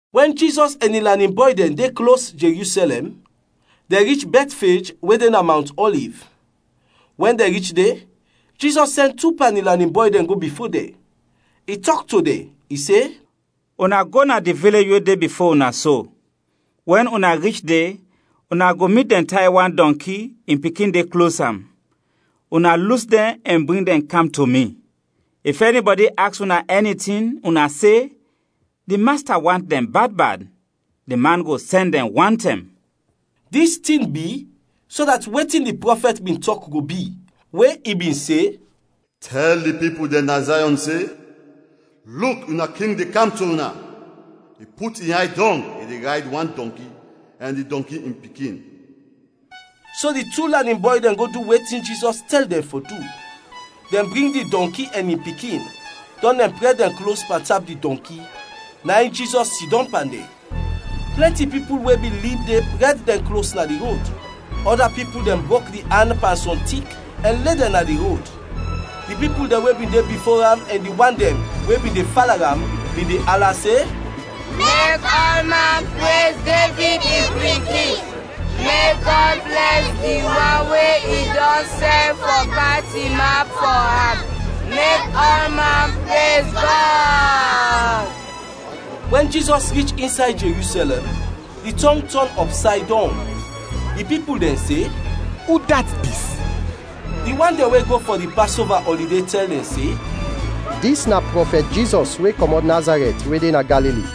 Wɛn Jizɔs ɛn in lanin bɔy dɛn de klos Jerusɛlɛm, dɛn rich Bɛtfej we de na Mawnt Ɔliv; wɛn dɛn rich de, Jizɔs sɛn tu pan in lanin bɔy dɛn go bifo dɛn. I tɔk to dɛn, i se, “Una go na di vilej we de bifo una so; wɛn una rich de, una go mit dɛn tay wan dɔnki, in pikin de klos am. Una lus dɛn ɛn bring dɛn kam to mi. If ɛnibɔdi aks una ɛni tin, una se, ‘Di Masta want dɛn bad bad’; di man go sɛn dɛn wantɛm.” Dis tin bi, so dat wetin di prɔfɛt bin tɔk go bi, we i bin se, “Tɛl di pipul dɛn na Zayɔn se, Luk, una king de kam to una! I put in yay dɔng, i de rayd wan dɔnki, ɛn di dɔnki in pikin.” So di tu lanin bɔy dɛn go du wetin Jizɔs tɛl dɛn fɔ du. Dɛn bring di dɔnki ɛn in pikin, dɔn dɛn prɛd dɛn klos pantap di dɔnki, na in Jizɔs sidɔm pan dɛn. Plɛnti pipul we bin lib de prɛd dɛn klos na di rod, ɔda pipul dɛn brok di an pan sɔm tik ɛn le dɛn na di rod. Di pipul dɛn we bin de bifo am ɛn di wan dɛn we bin de fala am bin de ala se, “Mek ɔlman prez Devid in pikin! Mek Gɔd blɛs di wan we i dɔn sɛn fɔ kam tinap fɔ am! Mek ɔlman prez Gɔd!” Wɛn Jizɔs rich insay Jerusɛlɛm, di tɔng tɔn ɔpsay dɔng. Di pipul dɛn se, “Udat dis?” Di wan dɛn we go fɔ di Pasova ɔlide tɛl dɛn se, “Dis na prɔfɛt Jizɔs we kɔmɔt Nazarɛt we de na Galili.”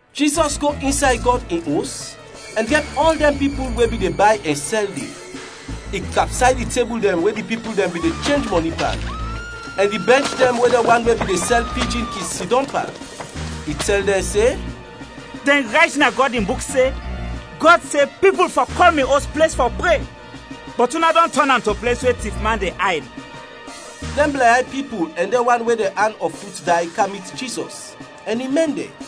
Jizɔs go insay Gɔd in Os, ɛn drɛb ɔl dɛn pipul we bin de bay ɛn sɛl de. I kapsay di tebul dɛn we di pipul dɛn bin de chenj mɔni pan, ɛn di bɛnch dɛn we dɛn wan we bin de sɛl pijin kin sidɔm pan. I tɛl dɛn se, “Dɛn rayt na Gɔd in Buk se, Gɔd se, ‘Pipul fɔ kɔl mi Os ples fɔ pre,’ bɔt una dɔn tɔn am to ples we tifman de ayd.” Dɛn blɛnyay pipul ɛn dɛn wan we dɛn an ɔ fut day kam mit Jizɔs, ɛn i mɛn dɛn.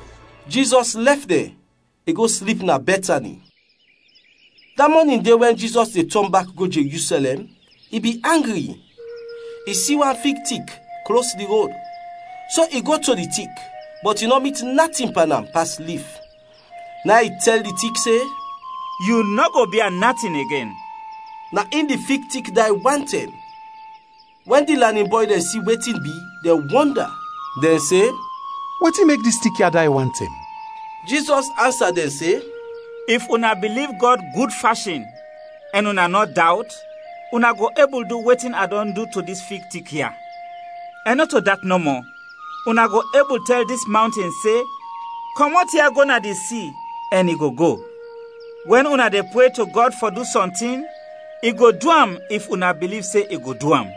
Jizɔs lɛf dɛn, i go slip na Bɛtani. Da mɔnin de wɛn Jizɔs de tɔn bak go Jerusɛlɛm, i bin angri. I si wan fig tik, klos di rod, so i go to di tik, bɔt i nɔ mit natin pan am pas lif. Na in i tɛl di tik se, “Yu nɔ go bia natin igen!” Na in di fig tik day wantɛm. Wɛn di lanin bɔy dɛn si wetin bi, dɛn wɔnda. Dɛn se, “Wetin mek dis tik ya day wantɛm?” Jizɔs ansa dɛn se, “If una biliv Gɔd gud fashin, ɛn una nɔ dawt, una go ebul du wetin a dɔn du to dis fig tik ya; ɛn nɔto dat nɔmɔ, una go ebul tɛl dis mawnten se, ‘Kɔmɔt ya, go na di si’ ɛn i go go. Wɛn una de pre to Gɔd fɔ du sɔntin, i go du am if una biliv se i go du am.”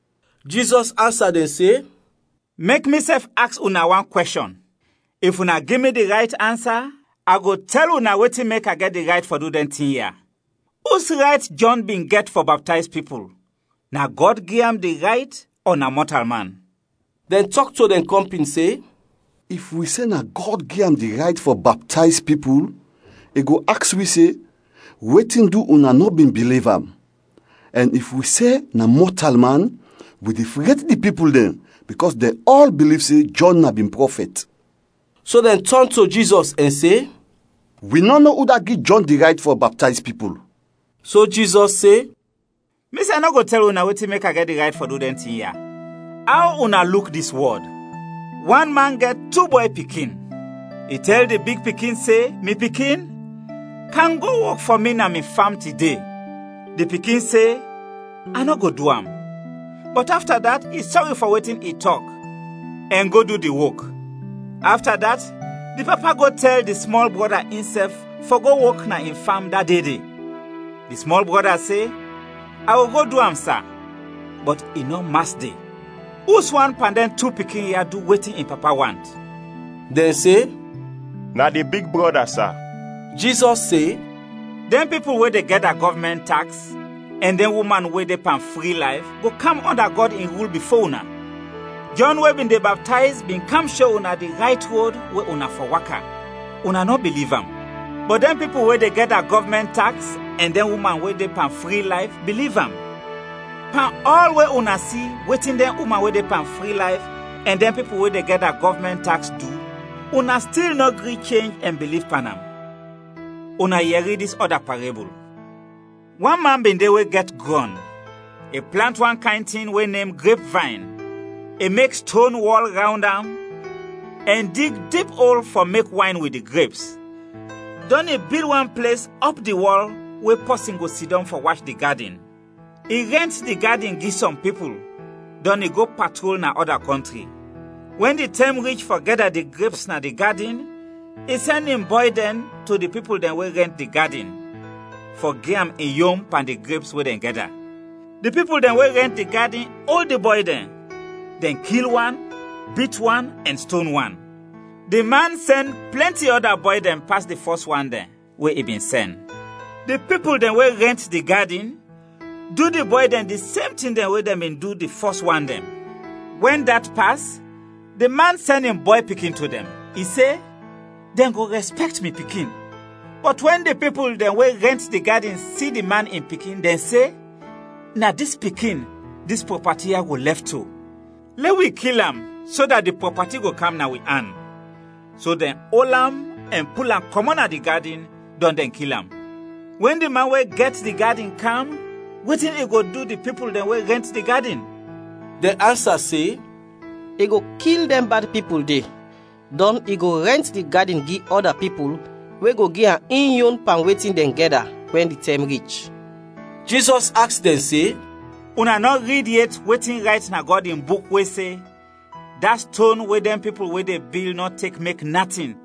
Jizɔs ansa dɛn se, “Mek misɛf aks una wan kwɛshɔn; if una gi mi di rayt ansa, a go tɛl una wetin mek a gɛt di rayt fɔ du dɛn tin ya. Us rayt Jɔn bin gɛt fɔ baptayz pipul, na Gɔd gi am di rayt ɔ na mɔtalman?” Dɛn tɔk to dɛn kɔmpin se, “If wi se na Gɔd gi am di rayt fɔ baptayz pipul, i go aks wi se, ‘Wetin du una nɔ bin biliv am?’ Ɛn if wi se ‘Na mɔtalman’ wi de fred di pipul dɛn bikɔs dɛn ɔl biliv se Jɔn na bin prɔfɛt.” So dɛn tɔn to Jizɔs ɛn se, “Wi nɔ no udat gi Jɔn di rayt fɔ baptayz pipul.” So Jizɔs se, “Misɛf nɔ go tɛl una wetin mek a gɛt di rayt fɔ du dɛn tin ya. “Aw una luk dis wɔd? Wan man gɛt tu bɔy pikin, i tɛl di big pikin se, ‘Mi pikin, kam go wok fɔ mi na mi fam tide.’ Di pikin se, ‘A nɔ go du am,’ bɔt afta dat, i sɔri fɔ wetin i tɔk ɛn go du di wok. Afta dat, di papa go tɛl di smɔl brɔda insɛf fɔ go wok na in fam da de de, di smɔl brɔda se, ‘A go go du am, sa,’ bɔt i nɔ mas de. Uswan pan dɛn tu pikin ya du wetin in papa want?” Dɛn se, “Na di big brɔda, sa.” Jizɔs se, “Dɛn pipul we de gɛda gɔvmɛnt taks ɛn dɛn uman we de pan fri layf, go kam ɔnda Gɔd in rul bifo una. Jɔn we bin de baptayz bin kam sho una di rayt rod we una fɔ waka, una nɔ biliv am; bɔt dɛn pipul we de gɛda gɔvmɛnt taks ɛn dɛn uman we de pan fri layf, biliv am. Pan ɔl we una si wetin dɛn uman we de pan fri layf ɛn dɛn pipul we de gɛda gɔvmɛnt taks du, una stil nɔ gri chenj ɛn biliv pan am. “Una yɛri dis ɔda parebul. Wan man bin de we gɛt grɔn, i plant wan kayn tin we nem grepvayn, i mek ston wɔl rawnd am ɛn dig dip ol fɔ mek wayn wit di greps, dɔn i bil wan ples ɔp di wɔl we pɔsin go sidɔm fɔ wach di gadin. I rɛnt di gadin gi sɔm pipul, dɔn i go patrol na ɔda kɔntri. Wɛn di tɛm rich fɔ gɛda di greps na di gadin, i sɛn in bɔy dɛn to di pipul dɛn we rɛnt di gadin, fɔ gi am in yon pan di greps we dɛn gɛda. Di pipul dɛn we rɛnt di gadin ol di bɔy dɛn, dɛn kil wan, bit wan, ɛn ston wan. Di man sɛn plɛnti ɔda bɔy dɛn pas di fɔs wan dɛn we i bin sɛn. Di pipul dɛn we rɛnt di gadin du di bɔy dɛn di sem tin dɛn we dɛn bin du di fɔs wan dɛn. Wɛn dat pas, di man sɛn in bɔy pikin to dɛn. I se, ‘Dɛn go rɛspɛkt mi pikin.’ Bɔt wɛn di pipul dɛn we rɛnt di gadin si di man in pikin, dɛn se, ‘Na dis pikin, dis prɔpati ya go lɛf to, lɛ wi kil am so dat di prɔpati go kam na wi an.’ So dɛn ol am ɛn pul am kɔmɔt na di gadin, dɔn dɛn kil am. “Wɛn di man we gɛt di gadin kam, wetin i go du di pipul dɛn we rɛnt di gadin?” Dɛn ansa se, “I go kil dɛn bad pipul de, dɔn i go rɛnt di gadin gi ɔda pipul we go gi am in yon pan wetin dɛn gɛda, wɛn di tɛm rich.” Jizɔs aks dɛn se, “Una nɔ rid yet wetin rayt na Gɔd in Buk we se, ‘Da ston we dɛn pipul we de bil nɔ tek mek natin,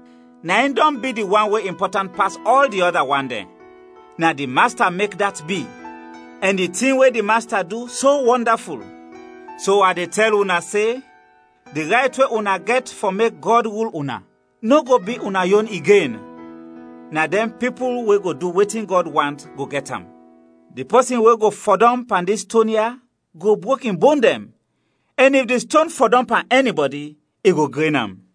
na in dɔn bi di wan we impɔtant pas ɔl di ɔda wan dɛn. Na di Masta mek dat bi, ɛn di tin we di Masta du, so wɔndaful!’ “So a de tɛl una se, ‘Di rayt we una gɛt fɔ mek Gɔd rul una nɔ go bi una yon igen, na dɛn pipul we go du wetin Gɔd want go gɛt am.’ [ Di pɔsin we go fɔdɔm pan dis ston ya go brok in bon dɛn, ɛn if di ston fɔdɔm pan ɛnibɔdi, i go gren am.]”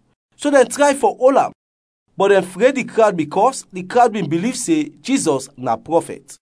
so dɛn tray fɔ ol am, bɔt dɛn fred di krawd bikɔs di krawd bin biliv se Jizɔs na prɔfɛt.